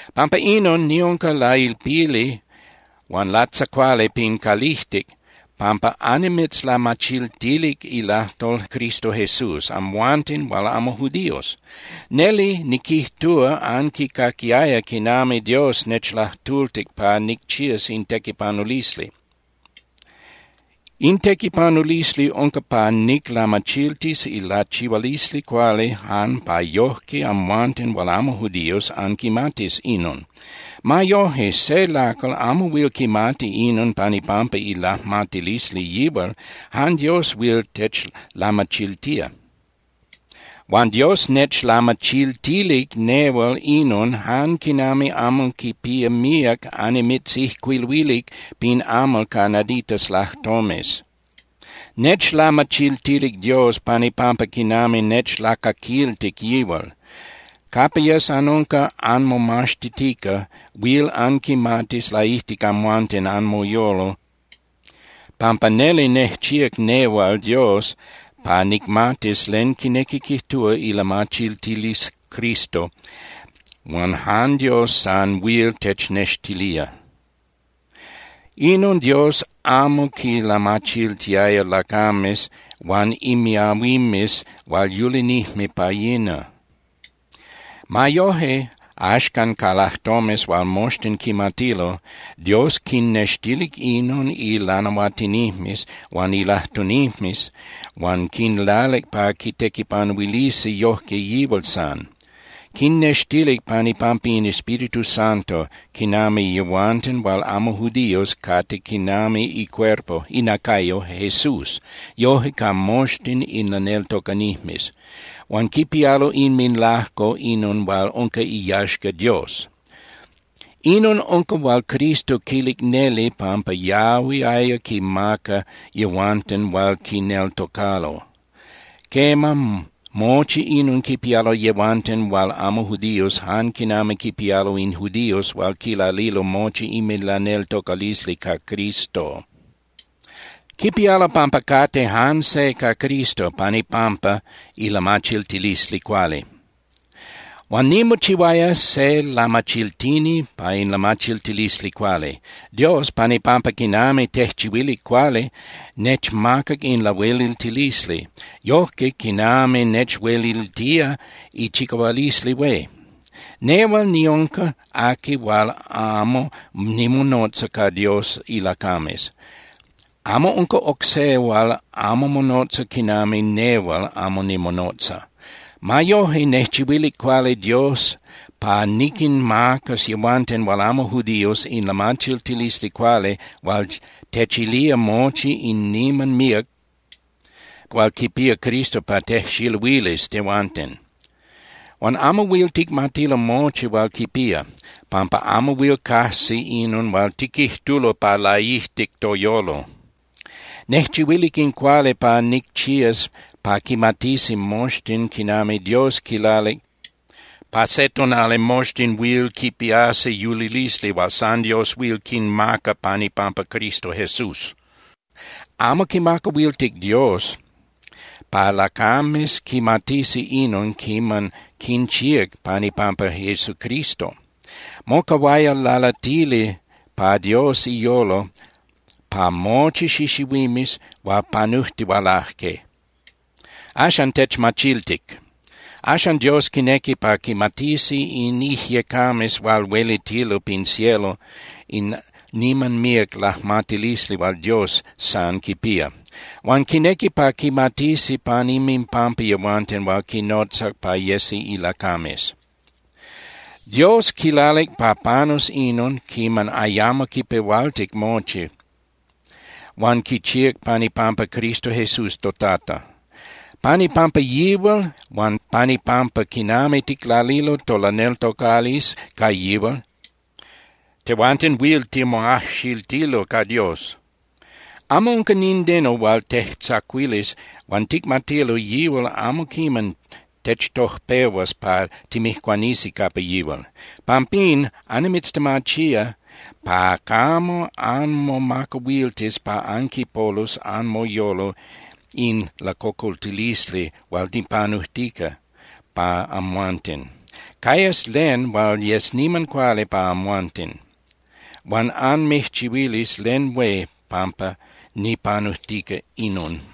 Pampa inon, niunca lailpili huan latzacuali pin calijtic pampa annimitzlamachiltilic ilajtol Cristo Jesús amhuanten hual amo judíos. Neli niquijtúa anquicaquiaya quinami Dios nechlajtultic pa nicchías in tequipanulisli. In tequipanulisli unca pa niclamachiltis ilachihualisli cuali jan pa yojque amhuanten hual amo judíos anquimatis inon. Ma yoje, se lacal amo huil quimati inon pan ipampa ilajmatilisli yihual, jan Dios huil techlamachiltía. Huan Dios nechlamachiltilic nehual inon jan quinami amo quipía míac annimitzijcuiluilic pin amal ca naditas lajtomes. Nechlamachiltilic Dios pan ipampa quinami nechlacaquiltic yihual. Capa yes anunca anmomaxtitica, huil anquimatis laijtic amhuanten anmoyolo pampa neli nejchíac nehual Dios pa nicmatis len quinequi quijtúa ilamachiltilisli Cristo hual jan Dios san huil technextilía. Inon Dios amo quilamachiltiaya lacames huan imiahuimes hual yulinijme pa yina. Ma yoje, axcan ca lajtomes hual moxtin quimatilo, Dios quinnextilic inon ilanahuatinijmes huan ilajtunijmes huan quinlalic pa quitequipanuilisi yojque yihual san. Quinnextilic pan ipampa in Espíritu Santo quinami yehuanten hual amo judíos cate quinami icuerpo (inacayo) Jesús yoje ca moxtin in laneltocanijmes. Huan quipialo inminlajco inon hual unca iyaxca Dios. Inon unca hual Cristo quilic neli pampa yahuiaya quinmaca yehuanten hual quineltocalo. Quema, mochi inon quipialo yehuanten hual amo judíos jan quinami quipialo in judíos hual quilalilo mochi inminlaneltocalisli ca Cristo. Quipialo pampa cate jan se ca Cristo pan ipampa ilamachiltilisli cuali. Huan nimochihuaya se lamachiltini pa in lamachiltilisli cuali. Dios, pan ipampa quinami nejchihuilic cuali, nechmacac in lahueliltilisli yojque quinami nechueliltía ichicahualisli hué. Nehual niunca aqui hual amo nimonotza ca Dios ilacames. Amo unca oc se hual amo monotza quinami nehual amo nimonotza. Ma yoje, nejchihuilic cuali Dios pa niquinmacas yehuanten hual amo judíos in lamachiltilisli cuali hual techilía mochi in niman míac hual quipía Cristo pa tejxiluilis tehuanten. Huan amo huil ticmatilo mochi hual quipía, pampa amo huil cajsi inon hual tiquijtulo pa laijtic toyolo. Nejchihuilic in cuali pa nicchías pa quimatisi moxtin quinami Dios quilalic pa se tonali moxtin huil quipiasi yulilisli hual san Dios huil quinmaca pan ipampa Cristo Jesús. Amo quimacahuiltic Dios pa lacames quimatisi inon quiman quinchíac pan ipampa Jesucristo. Mocahuaya lalatili pa Dios iyolo pa mochi xixihuimes hual panujtihualaje. Axan techmachiltic. Axan Dios quinequi pa quimatisi in ijyecames hual huelitilo pin cielo in niman míac lajmatilisli hual Dios san quipía. Huan quinequi pa quimatisi pan inminpampa yehuanten hual quinnotzac pa yesi ilacames. Dios quilalic pa panus inon quiman ayamo quipehualtic mochi, huan quichíac pan ipampa Cristo Jesús toTata. Pan ipampa yihual huan pan ipampa quinami ticlalilo tolaneltocalisli ca yihual, tehuanten huil timoajxiltilo ca Dios. Amo unca nindeno hual tejtzacuilis huan ticmatilo yihual amo quiman techtojpehuas pa timijcuanisi capa yihual. Pampín, annimitztemachía pa camo anmomacahuiltis pa anquipolus anmoyolo in lacocoltilisli hual nipanujtica pa amhuanten. Cayas len hual yes niman cuali pa amhuanten huan anmijchihuilis len hué pampa nipanujtica inon.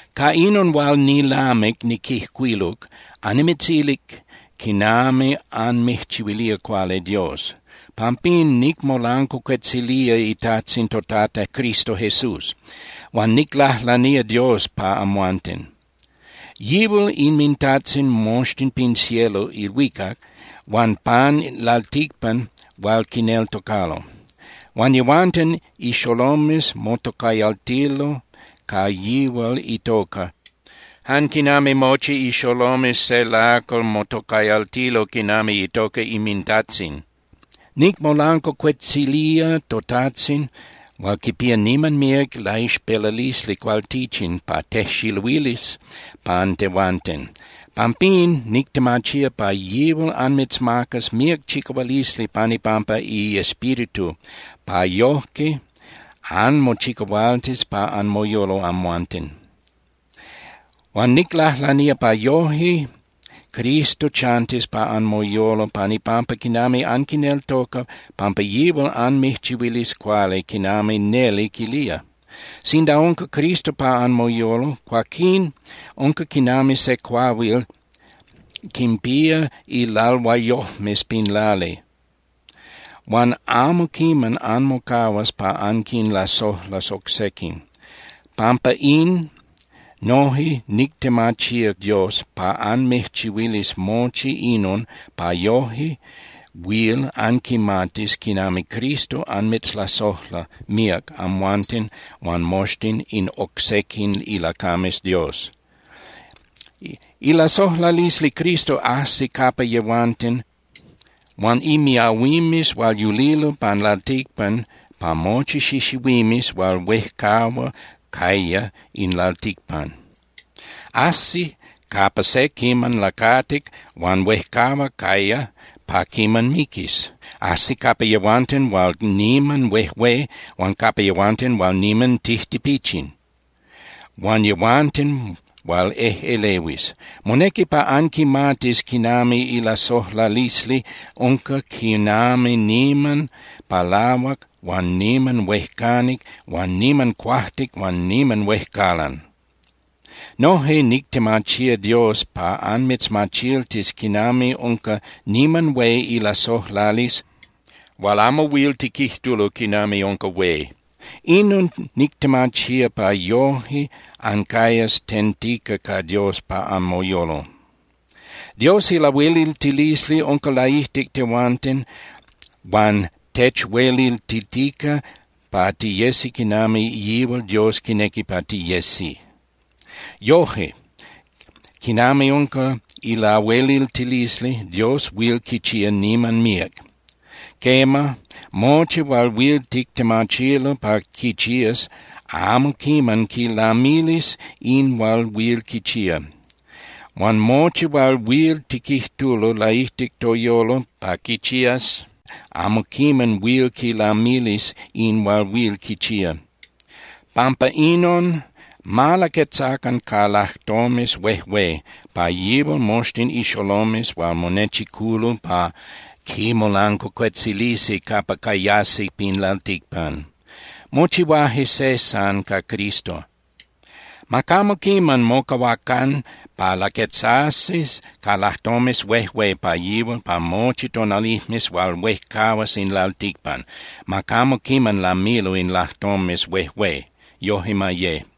Ca inon hual nilamic niquijcuiluc, annimitzilic quinami anmijchihuilía cuali Dios. Pampín nicmolancuacuetzilía iTajtzin toTata Cristo Jesús. Huan niclajlanía Dios pa amhuanten. Yihual inminTajtzin moxtin pin cielo (ilhuicac) huan pan lalticpan hual quineltocalo. Huan yehuanten ixolomes motocayaltilo ca yihual itoca jan quinami mochi ixolomes se lacal motocayaltilo quinami itoca inmintajtzin. Nicmolancuacuetzilía toTajtzin hual quipía niman míac ilaixpelalisli cualtichin pa tejxiluilis pan tehuanten. Pampín nictemachía pa yihual anmitzmacas míac chicahualisli pan ipampa iEspíritu pa yojque anmochicahualtis pa anmoyolo amhuanten. Huan niclajlanía pa yoje Cristo chantis pa anmoyolo pan ipampa quinami anquineltoca, pampa yihual anmijchihuilis cuali quinami neli quilía. Sinda unca Cristo pa anmoyolo, cuaquín unca quinami se cuahuil quinpía ilalhuayojmes pin lali, huan amo quiman anmocahuas pa anquinlasojlas oc sequin. Pampa in, noje nictemachía Dios pa anmijchihuilis mochi inon pa yoje huil anquimatis quinami Cristo anmitzlasojla míac amhuanten huan moxtin in oc sequin ilacames Dios. Ilasojlalisli Cristo ajsi capa yehuanten huan imiahuimes hual yulilo pan lalticpan pa mochi xixihuimes hual huejcahua caya in lalticpan. Ajsi capa se quiman lacatic huan huejcahua caya pa quiman miquis. Ajsi capa yehuanten hual niman huejué huan capa yehuanten hual niman tijtipichin huan yehuanten hual ejꞌelehuis. Monequi pa anquimatis quinami ilasojlalisli unca quinami niman palahuac huan niman huejcanic huan niman cuajtic huan niman huejcalan. Noje nictemachía Dios pa anmitzmachiltis quinami unca niman hué ilasojlalisli hual amo huil tiquijtulo quinami unca hué. Inon nictemachía pa yoje ancayas tentica ca Dios pa anmoyolo. Dios ilahueliltilisli unca laijtic tehuanten huan techueliltitica pa tiyesi quinami yihual Dios quinequi pa tiyesi. Yoje, quinami unca ilahueliltilisli, Dios huil quichía niman míac. Quema, mochi hual huil tictemachilo pa quichías amo quiman quilamilis in hual huil quichía. Huan mochi hual huil tiquijtulo laijtic toyolo pa quichías amo quiman huil quilamilis in hual huil quichía. Pampa inon, ma laquetzacan ca lajtomes huejué pa yihual moxtin ixolomes hual monechiculo pa quimolancuacuetzilisi capa cayasi pin lalticpan. Mochihuaje se san ca Cristo. ¡Ma camo quiman mocahuacan pa laquetzasi ca lajtomes huejué pa yihual pa mochi tonalijmes hual huejcahuas in lalticpan, ma camo quiman lamilo in lajtomes huejué! Yoje ma ye.